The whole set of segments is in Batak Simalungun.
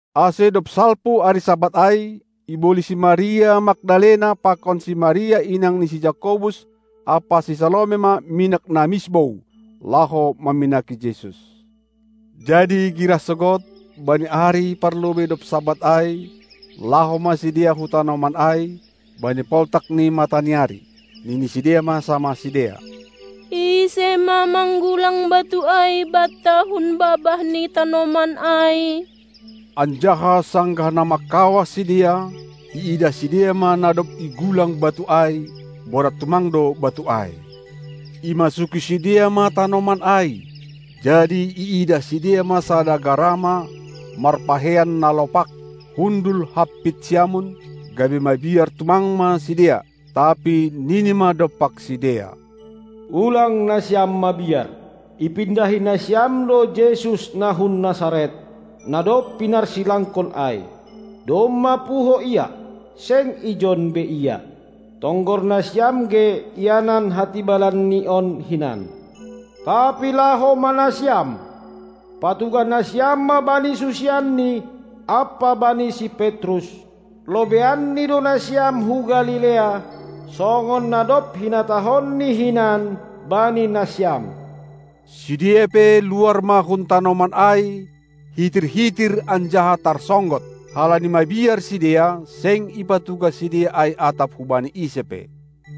Ase dob salpu ari Sabat ai, iboli si Maria Magdalena pakon si Maria inang ni si Jakobus ampa si Salome ma minak na misbou, laho maminaki Jesus. Jadi girah sogod, bani ari parlobei dob Sabat ai, laho ma sidea hu tanoman ai, bani poltak ni mataniari. Nini sidea ma samah sidea: Ise ma manggulang batu ai banta hun babah ni tanoman ai? Anjaha sanggah na mangkawah sidea, iidah sidea ma na dob igulang batu ai; borat tumang do batu ai. Imasuki sidea ma tanoman ai, jadi iidah sidea ma sada garama, marpakeian na lopak, hundul hampit siamun, gabe mabiar tumang ma sidea. Tapi nini ma dompak sidea: Ulang nasiam mabiar! Ipindahi nasiam do Jesus na hun Nasaret, na dob pinarsilangkon ai. Domma puho Ia, seng ijon be Ia. Tonggor nasiam ge ianan hatibalanNi on hinan! Tapi laho ma nasiam, patugah nasiam ma bani susianNi ampa bani si Petrus: LobeianNi do nasiam hu Galilea, songon na dob hinatahonNi hinan bani nasiam! Sidea pe luar ma hun tanoman ai, hitir-hitir anjaha tarsonggot. Halani mabiar sidea seng ipatugah sidea ai atap hubani ise pe.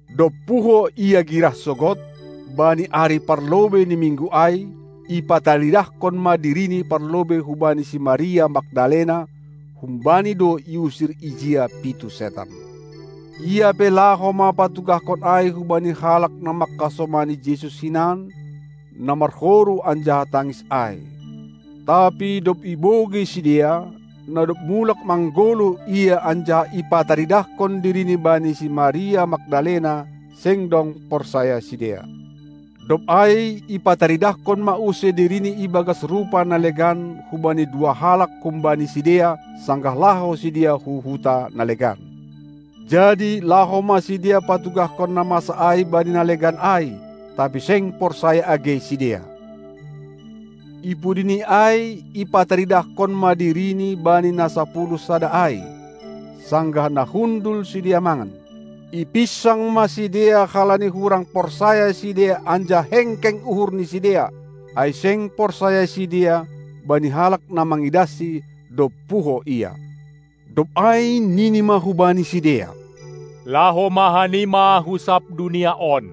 Dob puho Ia girah sogod, bani ari parlobei ni Minggu ai, ipataridahkon ma diriNi parlobei hubani si Maria Magdalena; humbani do iusir ijia pitu setan. Ia pe laho ma patugahkon ai hubani halak na mangkasomani Jesus hinan, na marhoru anjaha tangis ai. Tapi dob ibogei sidea, na dob mulak manggoluh Ia anjaha ipataridahkon diriNi bani si Maria Magdalena, seng dong porsaya sidea. Dob ai ipataridahkon ma use diriNi ibagas rupa na legan hubani dua halak humbani sidea, sanggah laho sidea hu huta na legan. Jadi laho ma sidea patugahkon na masa ai bani na legan ai, tapi seng porsaya age sidea. Ipudini ai ipataridahkon ma diriNi bani na sapuluh sada ai, sanggah na hundul sidea mangan. Ipinsang ma sidea halani hurang porsaya sidea anjaha hengkeng uhur ni sidea, ai seng porsaya sidea bani halak na mangidahSi, dob puho Ia. Dob ai nini ma hubani sidea: Laho ma hanima hu sab dunia on,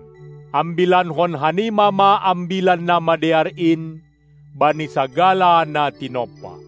ambilankon hanima ma Ambilan Namadear in bani sagala na tinompa.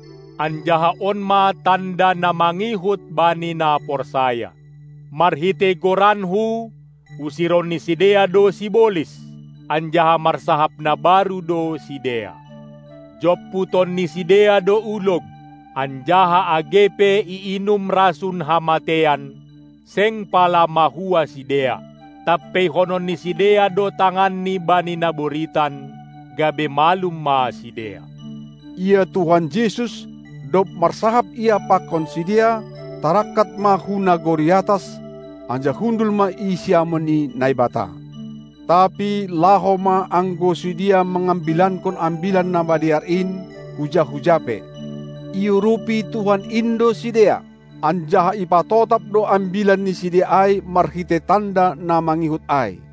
Anjaha on ma tanda na mangihut bani na porsaya: Marhitei goranKu usiron ni sidea do sibolis, anjaha marsahap na baru do sidea. Jomputon ni sidea do ulog, anjaha age pe iinum rasun hamateian, seng pala mahua sidea; tampeihonon ni sidea do tanganni bani na boritan gabe malum ma sidea. Ia Tuhan Jesus, dob marsahap Ia pakon sidea, tarangkat ma hu nagori atas, anjaha hundul ma i siamun ni Naibata. Tapi laho ma anggo sidea mangambilankon Ambilan Namadear in, huja-huja pe. Iurupi Tuhan in do sidea, anjaha ipatotap do ambilan ni sidea ai marhitei tanda na mangihut ai.